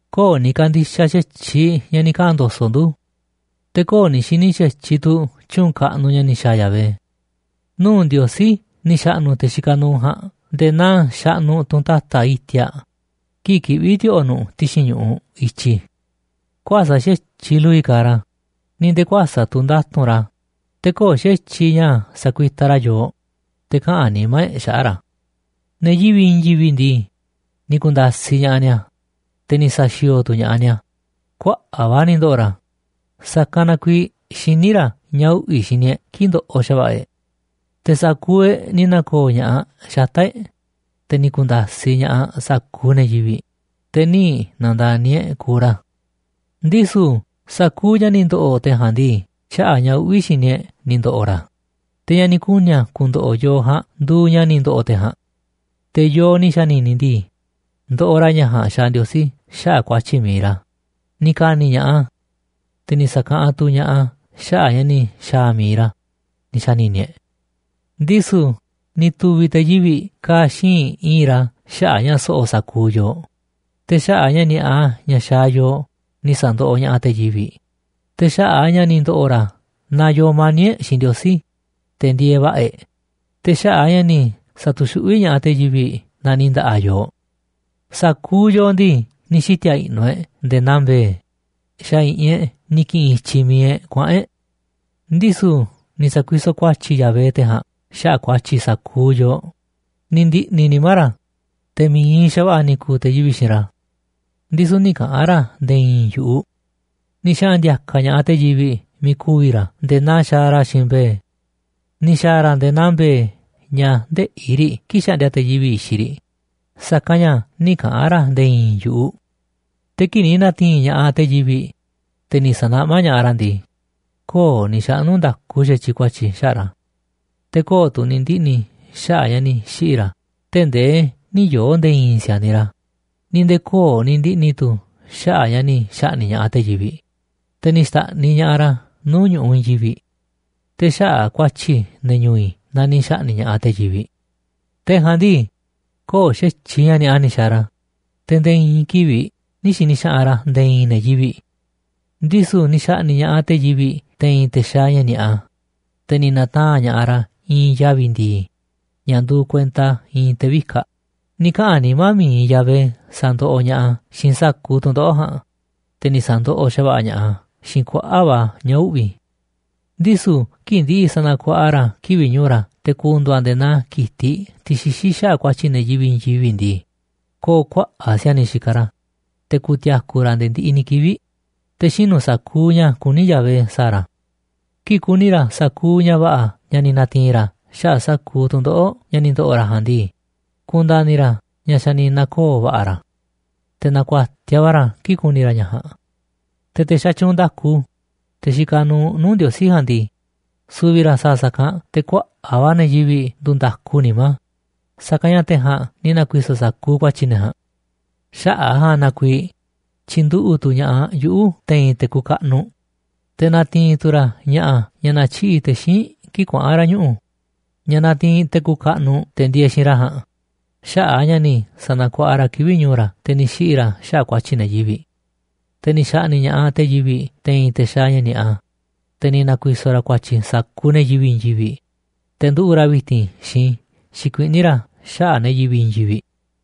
Köo̱ꞌ ni̱ ka̱ndi̱xaꞌ xa̱tyiꞌ ña̱ ni̱ kaꞌa̱n ndo̱so̱ꞌ ndu̱. Te̱ köo̱ꞌ ni̱ xi̱ni̱ xa̱tyiꞌ tu̱ tyu̱u̱n kaꞌnuꞌ ña̱ ni̱ xa̱a̱ Yahvé. Nuu̱ꞌ Ndiosí ni̱ xa̱ꞌnu̱ te̱ xikaꞌ nuuꞌ ja̱a̱nꞌ nde̱e̱ naa xaꞌnuꞌ tunꞌ ta̱ta̱ iti̱a̱ꞌ kii̱ꞌ kiꞌví ti̱o̱ꞌo̱ nu̱ꞌ ti̱xi̱n ñu̱ꞌuꞌ i̱tyi. Kuäsa̱ꞌ xa̱tyiꞌ lu̱vi̱ kaaꞌ ra̱, ni̱ nde̱e̱ kuäsa̱ꞌ tu̱ nda̱tu̱nꞌ ra̱. Te̱ köo̱ꞌ xa̱tyiꞌ ña̱ sa̱kuitaꞌ ra̱ yoo, te̱ kaꞌa̱n nimá e̱ꞌ xaꞌa̱ꞌ ra̱. Ne̱ yivi̱ꞌ i̱i̱n yivi̱ꞌ ndii, ni̱ ku̱nda̱siꞌ ña̱ꞌaꞌ ni̱a̱, te̱ ni̱ sa̱xi̱o̱o̱ tu̱ ña̱ꞌaꞌ ni̱a̱. Kuaꞌa̱ꞌ va̱ ni̱ ndo̱ꞌo̱ ra̱, sa̱kanꞌ na kuiiꞌ xiní ra̱ ña̱ uꞌvi̱ xini e̱ꞌ kii̱ꞌ ndoꞌoꞌ xa̱va̱ꞌa̱ e̱ꞌ. Te̱ sa̱kuuꞌ e̱ꞌ ni̱ na̱ko̱o̱ ña̱ꞌaꞌ xata̱ꞌ e̱ꞌ, te̱ ni̱ ku̱nda̱siꞌ ña̱ꞌaꞌ sa̱kuuꞌ ne̱ yivi̱ꞌ, te̱ nï̱ na̱nda̱ni̱ e̱ꞌ kuuꞌ ra̱. Ndisu̱ sa̱kuuꞌ ña̱ ni̱ ndo̱ꞌo̱ te̱ ja̱a̱nꞌ ndii, xaꞌa̱ꞌ ña̱ uꞌvi̱ xini e̱ꞌ ni̱ ndo̱ꞌo̱ ra̱ a̱. Te̱ ña̱ ni̱ kuni̱ a̱ ku̱ndo̱ꞌo̱ yooꞌ ja̱a̱nꞌ nduuꞌ ña̱ ni̱ ndo̱ꞌo̱ te̱ ja̱a̱nꞌ. Te̱ yooꞌ ni̱ xa̱ni̱ni̱ ndii, ndoꞌoꞌ ra̱ ña̱ ja̱a̱nꞌ xaaꞌ Ndiosí xaꞌa̱ꞌ ku̱a̱tyi̱ mi̱iꞌ ra̱, ni̱ ka̱ni̱ ña̱ꞌaꞌ a̱, te̱ ni̱ sa̱kaꞌanꞌ tu̱ ña̱ꞌaꞌ a̱ xaꞌa̱ꞌ ña̱ ni̱ xa̱a̱ mi̱iꞌ ra̱, ni̱ xa̱ni̱ni̱ e̱ꞌ. Ndisu̱ ni̱ tu̱vi̱ te̱ yivi̱ꞌ ka̱a̱ xíinꞌ i̱i̱nꞌ ra̱ xaꞌa̱ꞌ ña̱ so̱ꞌo̱ sa̱kuuꞌ yooꞌ. Te̱ xaꞌa̱ꞌ ña̱ ni̱a̱ꞌa ña̱ xaaꞌ yooꞌ ni̱ sa̱ndoꞌoꞌ ña̱ꞌaꞌ te̱ yivi̱ꞌ. Te̱ xaꞌa̱ꞌ a̱ ña̱ ni̱ ndo̱ꞌo̱ ra̱ na yoo mani̱ꞌ e̱ꞌ xiinꞌ Ndiosí, te̱ ndieeꞌ va̱ꞌa̱ e̱ꞌ. Te̱ xaꞌa̱ꞌ a̱ ña̱ ni̱ sa̱tu̱xuꞌví ña̱ꞌaꞌ te̱ yivi̱ꞌ na ni̱ nda̱ꞌa̱ yooꞌ. Sa̱kuuꞌ yooꞌ ndii, ni̱ xiti̱a̱ i̱ꞌnu̱ e̱ꞌ nde̱e̱ naa mbe̱e̱. Te̱ xa̱ i̱ꞌi̱n xa̱ i̱ꞌi̱n e̱ꞌ ni̱ ki̱ꞌi̱n i̱tyiꞌ mi̱iꞌ e̱ꞌ kuaꞌa̱n e̱ꞌ. Ndisu̱ ni̱ sa̱kuisoꞌ ku̱a̱tyi̱ Yahvé te̱ jaa̱nꞌ xaꞌa̱ꞌ ku̱a̱tyi̱ sa̱kuuꞌ yooꞌ. Ni̱ ndi̱ꞌni̱ nimá ra̱, te̱ mi̱iꞌ xa̱va̱ꞌa̱ ni̱ ku̱u̱ te̱ yivi̱ꞌ xiinꞌ ra̱, ndisu̱ nï̱ kaꞌa̱n ra̱ nde̱e̱ i̱i̱n yu̱ꞌuꞌ. Ni̱ xaꞌa̱n ndi̱a̱ka̱ ña̱ꞌaꞌ te̱ yivi̱ꞌ miiꞌ ku̱vi̱ ra̱ nde̱e̱ naa xaaꞌ ra̱ xiinꞌ mbe̱e̱. Ni̱ xa̱a̱ ra̱ nde̱e̱ naa mbe̱e̱ ña̱ ndëꞌí riꞌ kii̱ꞌ xaꞌndia te̱ yivi̱ꞌ i̱xiꞌ riꞌ, sa̱kanꞌ ña̱ nï̱ kaꞌa̱n ra̱ nde̱e̱ i̱i̱n yu̱ꞌuꞌ. Te̱ kii̱ꞌ ni̱ na̱ti̱i̱n ña̱ꞌaꞌ te̱ yivi̱ꞌ, te̱ ni̱ sa̱naꞌmá ña̱ꞌaꞌ ra̱ ndii, köo̱ꞌ ni̱ xaꞌnu̱ nda̱ku xa̱tyiꞌ ku̱a̱tyi̱ xaꞌa̱ꞌ ra̱. Te̱ köo̱ꞌ tu̱ ni̱ ndiꞌni̱ xaꞌa̱ꞌ ña̱ ni̱ xiꞌi̱ ra̱ tee̱ꞌ ndee nï̱ yoo̱ nde̱e̱ i̱i̱n si̱a̱niꞌ ra̱, ni̱ nde̱e̱ köo̱ꞌ ni̱ ndiꞌni̱ tu̱ xaꞌa̱ꞌ ña̱ ni̱ xa̱ꞌni̱ꞌ ña̱ꞌaꞌ te̱ yivi̱ꞌ, te̱ ni̱ xta̱ꞌniꞌ ña̱ꞌaꞌ ra̱ nuu̱ꞌ ñu̱ꞌuꞌ i̱i̱n yivi̱ꞌ. Te̱ xaꞌa̱ꞌ ku̱a̱tyi̱ ne̱ ñu̱u̱ i̱ na ni̱ xa̱ꞌni̱ꞌ ña̱ꞌaꞌ te̱ yivi̱ꞌ. Te̱ ja̱a̱nꞌ ndii, köo̱ꞌ xa̱tyiꞌ ña̱ ni̱a̱ꞌa ni̱ xa̱a̱ ra̱, te̱ nde̱e̱ i̱i̱n kivi̱ꞌ nï̱ xi̱ni̱ xaꞌanꞌ ra̱ nde̱e̱ i̱i̱n ne̱ yivi̱ꞌ. Ndisu̱ ni̱ xa̱ꞌni̱ꞌ ña̱ꞌaꞌ te̱ yivi̱ꞌ te̱i̱n te̱ xaaꞌ ña̱ ni̱a̱ꞌa, te̱ ni̱ na̱taa̱nꞌ ña̱ꞌaꞌ ra̱ i̱i̱n yavi̱ ndi̱i̱ ña̱ nduuꞌ kuenta i̱i̱n te̱ vikaꞌ. Ni̱ kaꞌa̱n nimá mi̱iꞌ Yahvé sa̱ndoꞌoꞌ ña̱ꞌaꞌ a̱ xiinꞌ sa̱kuuꞌ tu̱ndoꞌo̱ꞌ ja̱a̱nꞌ, te̱ ni̱ sa̱ndoꞌoꞌ xa̱va̱ꞌa̱ ña̱ꞌaꞌ a̱ xiinꞌ kuaꞌa̱ꞌ va̱ ña̱ uꞌvi̱. Ndisu̱ kii̱ꞌ ndi̱ꞌi̱ sa̱na̱kuaꞌa ra̱ kivi̱ꞌ ñu̱u̱ ra̱ te̱ ku̱ndu̱u̱ a̱ nde̱e̱ naa ki̱tiꞌ, tiꞌ xixí xaꞌa̱ꞌ ku̱a̱tyi̱ ne̱ yivi̱ꞌ i̱i̱n yivi̱ꞌ ndii, ko̱o̱ kuaꞌa̱ꞌ si̱a̱niꞌ xikaꞌ ra̱. Te̱ ku̱ti̱a̱ku̱ ra̱ nde̱e̱ ndiꞌiꞌ ni̱ kivi̱ꞌ, te̱ xinu̱ sa̱kuuꞌ ña̱ kuní Yahvé sa̱a̱ ra̱. Kii̱ꞌ ku̱ni̱ ra̱ sa̱kuuꞌ ña̱ va̱ꞌa̱ ña̱ ni̱ na̱ti̱i̱n ra̱ xaꞌa̱ꞌ sa̱kuuꞌ tu̱ndoꞌo̱ꞌ ña̱ ni̱ ndo̱ꞌo̱ ra̱ ja̱a̱nꞌ ndii, ku̱nda̱ni̱ ra̱ ña̱ xa̱ ni̱ na̱koo̱ va̱ꞌa̱ ra̱, te̱ na̱ku̱a̱tiaꞌ va̱ ra̱ kii̱ꞌ ku̱ni̱ ra̱ ña̱ ja̱a̱nꞌ. Te̱ te̱ xatyuunꞌ nda̱ku, te̱ xikaꞌ nuuꞌ nuu̱ꞌ Ndiosí ja̱a̱nꞌ ndii, su̱vi̱ ra̱ sa̱a̱ sa̱kanꞌ te̱ kuaꞌa̱ꞌ va̱ ne̱ yivi̱ꞌ nduu̱ nda̱ku nimá, sa̱kanꞌ ña̱ te̱ ja̱a̱nꞌ ni̱ na̱ku̱i̱so̱ sa̱kuuꞌ ku̱a̱tyi̱ ne̱ ja̱a̱nꞌ. Xaꞌa̱ꞌ a̱ ja̱a̱nꞌ na kuiiꞌ tyi̱nduꞌu̱ꞌ tu̱ ña̱ꞌaꞌ yuꞌu̱ te̱i̱n te̱ kuuꞌ kaꞌnuꞌ, te̱ na̱ti̱i̱n tu̱ ra̱ ña̱ꞌa̱ ña̱ na̱tyiꞌi̱ꞌ te̱ xíinꞌ kii̱ꞌ kuaꞌa̱n ra̱ ñuꞌu̱, ña̱ natiinꞌ te̱ kuuꞌ kaꞌnuꞌ te̱ ndieeꞌ xiinꞌ ra̱ ja̱a̱nꞌ xaꞌa̱ꞌ a̱ ña̱ ni̱ sa̱na̱kuaꞌa ra̱ kivi̱ꞌ ñu̱u̱ ra̱, te̱ ni̱ xiꞌi̱ ra̱ xaꞌa̱ꞌ ku̱a̱tyi̱ ne̱ yivi̱ꞌ. Te̱ ni̱ xa̱ꞌni̱ꞌ ña̱ꞌaꞌ te̱ yivi̱ꞌ te̱i̱n te̱ xaaꞌ ña̱ ni̱a̱ꞌa, te̱ ni̱ na̱ku̱i̱so̱ ra̱ ku̱a̱tyi̱ sa̱kuuꞌ ne̱ yivi̱ꞌ i̱i̱n yivi̱ꞌ, te̱ nduꞌu̱ꞌ ra̱ vi̱ti̱n xikuiꞌní ra̱ xaꞌa̱ꞌ ne̱ yivi̱ꞌ i̱i̱n yivi̱ꞌ.